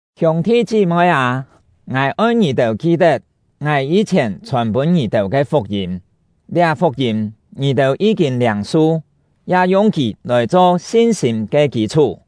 Hiûng-thi chí-moi â, ngài oi ngì-têu ki-tet ngài yî-chhièn chhòn-pûn ngì-têu ke fuk-yîm; liá fuk-yîm ngì-têu yí-kîn liâng-su, ya yung kì lòi cho sin-sîm ke kî-chhú.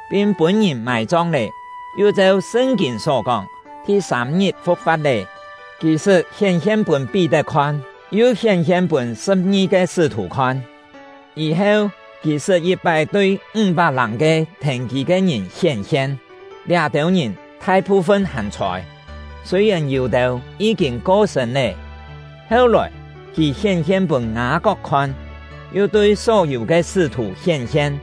pin pûn-ngìn mài-chong lé; yu cheu Sṳn-kîn só kóng, thi-sâm-ngit fu̍k-fa̍t lé. Kì sṳt hién-hien pûn Pí-tet khon, yu hién-hien pûn sṳ̍p-ngi-ke sṳ́-thù khon. Yî-heu, kì sṳt yit-pái tui ńg-pak-làng ke thèn kì ke ngìn hién-hien; liá-têu ngìn thai-phu-fun hàn chhôi, sûi-yèn yû-têu yí-kîn ko-sṳ̂n lé. Heu-lòi, kì hién-hien pûn Ngâ-kok khon, yu tui só-yû ke sṳ́-thù hién-hien.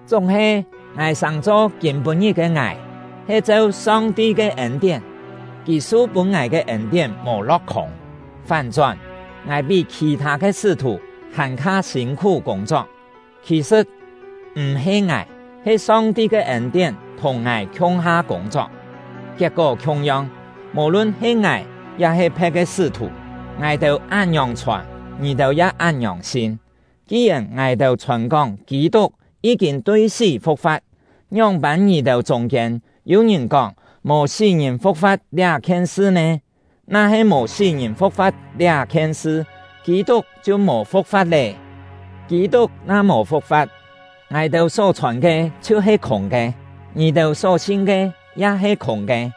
Chúng-he, ngài sàng-cho kîm-pû-ngit ke ngài, he cheu Song-ti ke ên-tién. Kì su-pûn ngài ke ên-tién mò lo̍k-khûng; fán-chón, ngài pí khì-thâ ke sṳ́-thù hàn-kha sîn-khú kûng-chok; khì-sṳ̍t, m̀-he ngài, he Song-ti ke ên-tién thùng ngài khiung-ha kûng-chok. Kiet-kó khiung-yong, mò-lun he ngài ya-he phe̍t ke sṳ́-thù, ngài-têu án-ngiòng chhòn, ngì-têu ya án-ngiòng sin. Ki-yèn ngài-têu chhòn-kóng Kî-tuk yí-kîn tui sí fu̍k-fa̍t, ngióng-pân ngì-têu chûng-kiên yû-ngìn kóng mò sí-ngìn fu̍k-fa̍t liá-khien sṳ nè? Na-he mò sí-ngìn fu̍k-fa̍t liá-khien sṳ, Kî-tuk chhiu mò fu̍k-fa̍t lé. Kî-tuk na mò fu̍k-fa̍t, ngài-têu só chhòn ke chhiu-he khûng ke, ngì-têu só sin ke ya he khûng ke.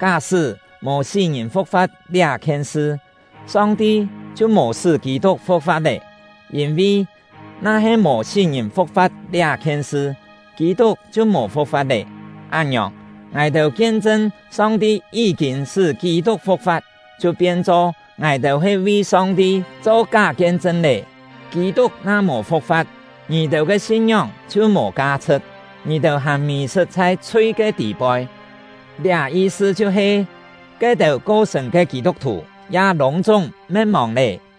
Ká-sṳ́ mò sí-ngìn fu̍k-fa̍t liá-khien sṳ, Song-ti chhiu mò sṳ́ Kî-tuk fu̍k-fa̍t lé, yîn-vi, na-he mò sí-ngìn fu̍k-fa̍t liá-khien sṳ, Kî-tuk chhiu mò fu̍k-fa̍t lé. Án-ngiòng, ngài-têu kien-chṳn Song-ti yí-kîn sṳ́ Kî-tuk fu̍k-fa̍t, chhiu pien-cho ngài-têu he vi Song-ti cho ká kien-chṳn lé. Kî-tuk na mò fu̍k-fa̍t, ngì-têu ke sin-ngióng chhiu mò ka-chhṳ̍t, ngì-têu hàn mì-sṳt chhai chhui ke tî-poi. Liá yi-sṳ chhiu-he, ke-têu ko-sṳ̂n ke Kî-tuk-thù ya lûng-chúng me̍t-mòng lé.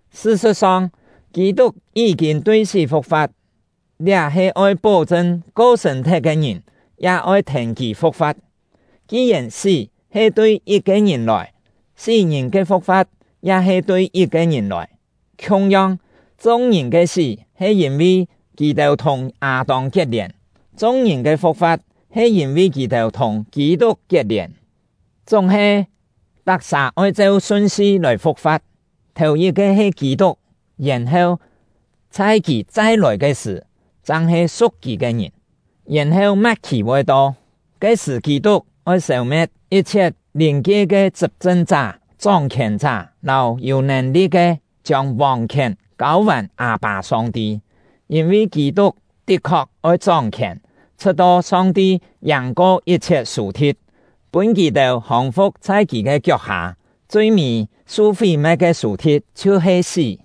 Sṳ-sṳ̍t-song, Kî-tuk yí-kîn tui sí fu̍k-fa̍t; liá he oi pó-chṳn ko-sṳ̂n-thet ke ngìn ya oi thèn kì fu̍k-fa̍t. Ki-yèn sí he tui yit-ke ngìn lòi, sí-ngìn ke fu̍k-fa̍t ya he tui yit-ke ngìn lòi. Khiung-yong, chung-ngìn ke sí he yîn-vi kì-têu thùng Â-tông kiet-lièn, chung-ngìn ke fu̍k-fa̍t he yîn-vi kì-têu thùng Kî-tuk kiet-lièn. Chúng-he, tak-sà oi cheu sun-si lòi fu̍k-fa̍t: Thèu-yit-ke he Kî-tuk; yèn-heu, chhai kì chai-lòi ke sṳ̀, chang he su̍k kì ke ngìn. Yèn-heu ma̍t-khì voi to; ke-sṳ̀ Kî-tuk oi sêu-me̍t yit-chhiet lìn-kie ke chṳp-chṳn-chá, chóng-khièn-chá, lâu yû nèn-li̍t ke, chiông vòng-khièn kâu-vàn Â-pâ Song-ti. Yîn-vi Kî-tuk tit-khok oi chóng-khièn, chhṳ̍t-to Song-ti yàng-ko yit-chhiet sù-thi̍t, pûn kì-têu hòng-fu̍k chhai kì ke kiok-hâ. Chui-mî su fí-me̍t ke sù-thi̍t chhiu-he sí.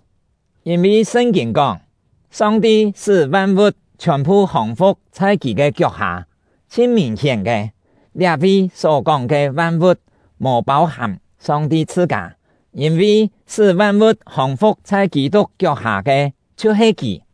Yîn-vi Sṳn-kîn kóng: “Song-ti sṳ́ van-vu̍t chhiòn-phu hòng-fu̍k chhai kì ke kiok-hâ.” Chhin mìn-hién ke, liá-vi só-kóng ke “van-vu̍t” mò pâu-hàm Song-ti chhṳ-kâ, yîn-vi sṳ́ van-vu̍t hòng-fu̍k chhai Kî-tuk kiok-hâ ke chhiu-he Kì.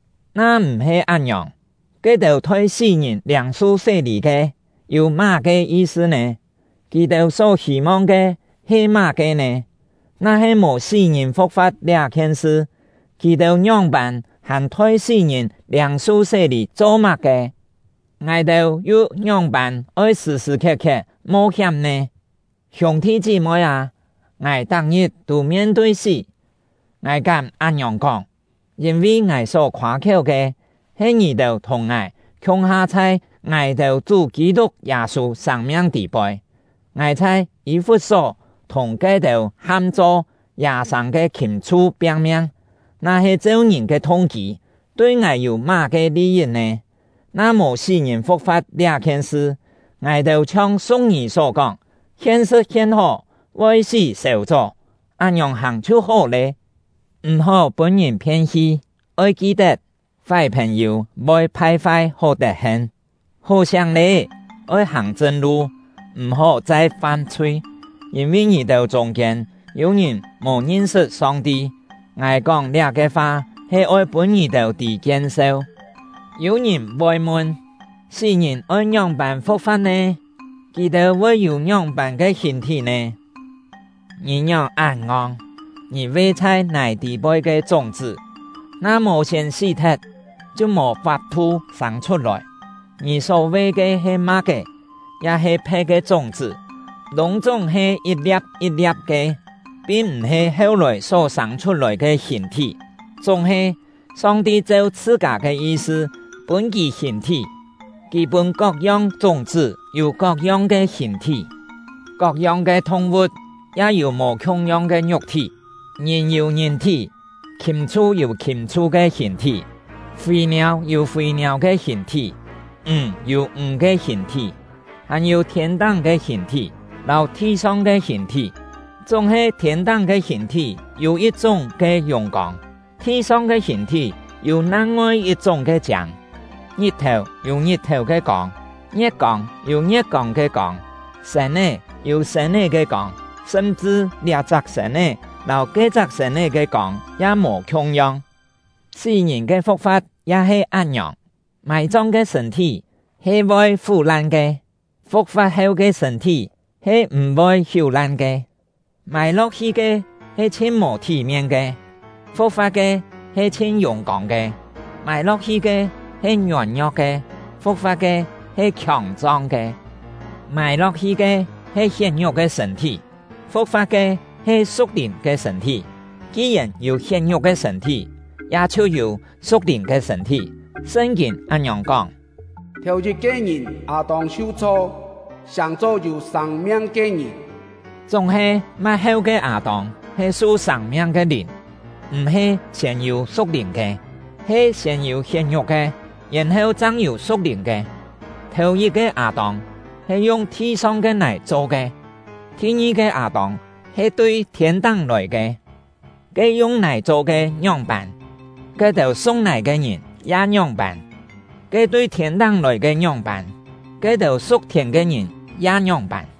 Na m̀-he án-ngiòng, ke-têu thoi sí-ngìn liâng-su sé-lî ke yû má-ke yi-sṳ nè? Kì-têu só hî-mong ke he má-ke nè? Na-he mò sí-ngìn fu̍k-fa̍t liá-khien sṳ, kì-têu ngióng-pân hàn thoi sí-ngìn liâng-su sé-lî cho má-ke? Ngài-têu yu ngióng-pân oi sṳ̀-sṳ̀ khiet-khiet mo-hiám nè? Hiûng-thi chí-moi â, ngài tak-ngit tû mien-tui sí! Ngài kám án-ngiòng kóng, yîn-vi ngài só khoâ-khiéu ke he ngì-têu thùng ngài khiung-ha chhai ngài-têu Chú Kî-tuk Yâ-sû sâng-miang tî-poi. Ngài chhai Yî-fut-só thùng ke-têu ham-cho “yâ-sâng ke khìm-chhu” piang-miang, na-he cheu ngìn ke thung-kî, tui ngài yû má-ke li-yit nè? Na mò sí-ngìn fu̍k-fa̍t liá-khien sṳ, ngài-têu chhiong siu̍k-ngî só kóng: “Hien sṳ̍t hien hó, voi sí sèu-chó!” án-ngiòng hàng chhiu hó lé. M̀-hó pûn-ngìn phien-hi; oi ki-tet: “Fái phèn-yû voi phai-fai hó tet-hen!” Hó-siáng lé, oi hàng chṳn-lu, m̀-hó chai fam-chhui; yîn-vi ngì-têu chûng-kiên yû ngìn mò ngin-sṳt Song-ti. Ngài kóng liá-ke fa he oi pûn ngì-têu tî kien-seu. Yû ngìn voi mun: “Sí-ngìn oi ngióng-pân fu̍k-fa̍t nè? Kì-têu voi yû ngióng-pân ke hìn-thí nè?” Ngì ngióng án ngong! Ngì ve chhai nài tî-poi ke chúng-chṳ́, na mò siên sí-thet, chhiu mò fap-thu sâng chhut-lòi. Ngì só ve ke he ma̍k-é, ya-he phe̍t-yong ke chúng-chṳ́, lûng-chúng he yit-lia̍p yit-lia̍p ke, pin m̀-he heu-lòi só sâng chhut-lòi ke hìn-thí. Chúng-he, Song-ti cheu chhṳ-kâ ke yi-sṳ pûn kì hìn-thí; Kì pûn kok-yong chúng-chṳ́ yû kok-yong ke hìn-thí. Kok-yong ke thung-vu̍t ya yû mò khiung-yong ke ngiuk-thí: Ngìn yû ngìn-thí, khìm-chhu yû khìm-chhu ke hìn-thí, fî-niâu yû fî-niâu ke hìn-thí, ǹg yû ǹg ke hìn-thí. Hàn-yû thiên-táng ke hìn-thí, lâu thi-song ke hìn-thí; chúng-he thiên-táng ke hìn-thí yû yit-chúng ke yùng-kông, thi-song ke hìn-thí yû nang-ngoi yit-chúng ke chiâng. Ngit-thèu yû ngit-thèu ke kông, ngie̍t-kông yû ngie̍t-kông ke kông, sên-é yû sên-é ke kông; sṳm-chṳ liá-chak sên-é lâu ke-chak sên-é ke kông ya mò khiung-yong. Sí-ngìn ke fu̍k-fa̍t ya he án-ngiòng. Mài-chong ke sṳ̂n-thí he voi fú-lan ke; fu̍k-fa̍t heu ke sṳ̂n-thí he m̀-voi hiú-lan ke. Mài-lo̍k-hi ke he chhin mò thí-mien ke, fu̍k-fa̍t ke he chhin yùng-kông ke; mài-lo̍k-hi ke he ngiôn-ngio̍k ke, fu̍k-fa̍t ke he khiòng-chong ke; mài-lo̍k-hi ke he hiet-ngiuk ke sṳ̂n-thí, fu̍k-fa̍t ke he su̍k-lìn ke sṳ̂n-thí. Ki-yèn yû hiet-ngiuk ke sṳ̂n-thí, ya chhiu yû su̍k-lìn ke sṳ̂n-thí. Sṳn-kîn án-ngiòng kóng: “Thèu-yit-ke ngìn Â-tông su-chho sàng-cho yû sâng-miang ke ngìn”; chúng-he, ma̍t-heu ke Â-tông he su sâng-miang ke Lìn. M̀-he siên yû su̍k-lìn ke; he siên yû hiet-ngiuk ke, yèn-heu chang yû su̍k-lìn ke. Thèu-yit-ke Â-tông he yung thi-song ke nài cho ke; thi-ngi-ke Â-tông he tui thiên-táng lòi ke. Ke yung nài cho ke ngióng-pân, ke-têu su̍k nài ke ngìn ya ngióng-pân; ke tui thiên-táng lòi ke ngióng-pân, ke-têu su̍k thiên ke ngìn ya ngióng-pân.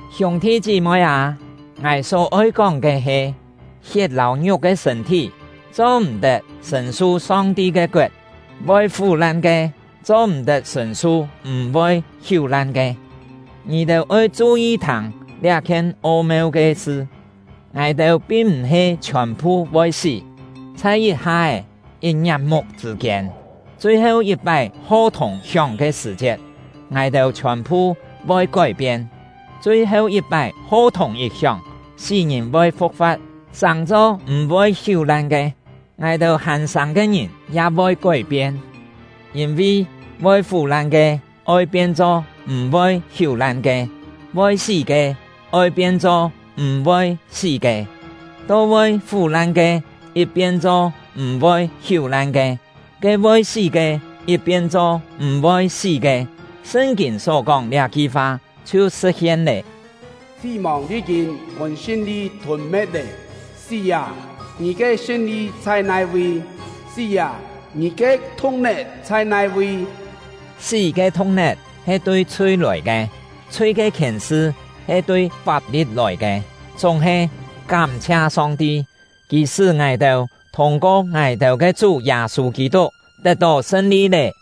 Hiûng-thi chí-moi â, ngài só-oi kóng ke he: Hiet lâu ngiuk ke sṳ̂n-thí cho-m̀-tet sṳ̀n-su Song-ti ke koet, voi fú-lan ke cho-m̀-tet sṳ̀n-su m̀-voi hiú-lan ke. Ngì-têu oi chu-yi thâng liá-khien o-meu ke sṳ: Ngài-têu pin m̀-he chhiòn-phu voi sí; chhai yit-ha-é, yit-ngiap-muk chṳ̂ kiên, chui-heu yit-pái ho-thùng hióng ke sṳ̀-chiet, ngài-têu chhiòn-phu voi kói-pien. Chui-heu yit-pái ho-thùng yit hióng, sí-ngìn voi fu̍k-fa̍t sàng-cho m̀-voi hiú-lan ke, ngài-têu hàn sâng ke ngìn ya voi kói-pien. Yîn-vi voi fú-lan ke oi pien-cho m̀-voi hiú-lan ke, voi sí ke oi pien-cho m̀-voi sí ke. To voi fú-lan ke yit pien-cho m̀-voi hiú-lan ke, ke voi sí ke yit pien-cho m̀-voi sí ke, Sṳn-kîn só kóng liá-ki fa chhiu sṳ̍t-hien lé: “Sí-mòng yí-kîn pûn sṳn-li thûn-me̍t lé!” Sí â! Ngì ke sṳn-li chhai nai-vi? Sí â! Ngì ke thu̍k-net chhai nai-vi? Sí ke thu̍k-net he tui chhui lòi ke, chhui ke khièn-sṳ he tui fap-li̍t lòi ke. Chúng-he, kám-chhia Song-ti! Kì sṳ́ ngài-têu thûng-ko ngài-têu ke Chú Yâ-sû Kî-tuk tet-tó sṳn-li lé!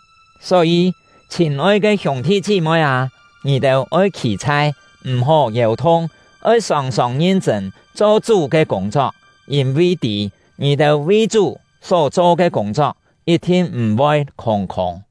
Só-yî, chhîn-oi ke hiûng-thi chí-moi â, ngì-têu oi khî-chhai, m̀-hó yèu-thung. Oi sòng-sòng ngin-chṳ̂n cho Chú ke kûng-chok; yîn-vi tî, ngì-têu vi Chú só-cho ke kûng-chok yit-thin m̀-voi khûng-khûng.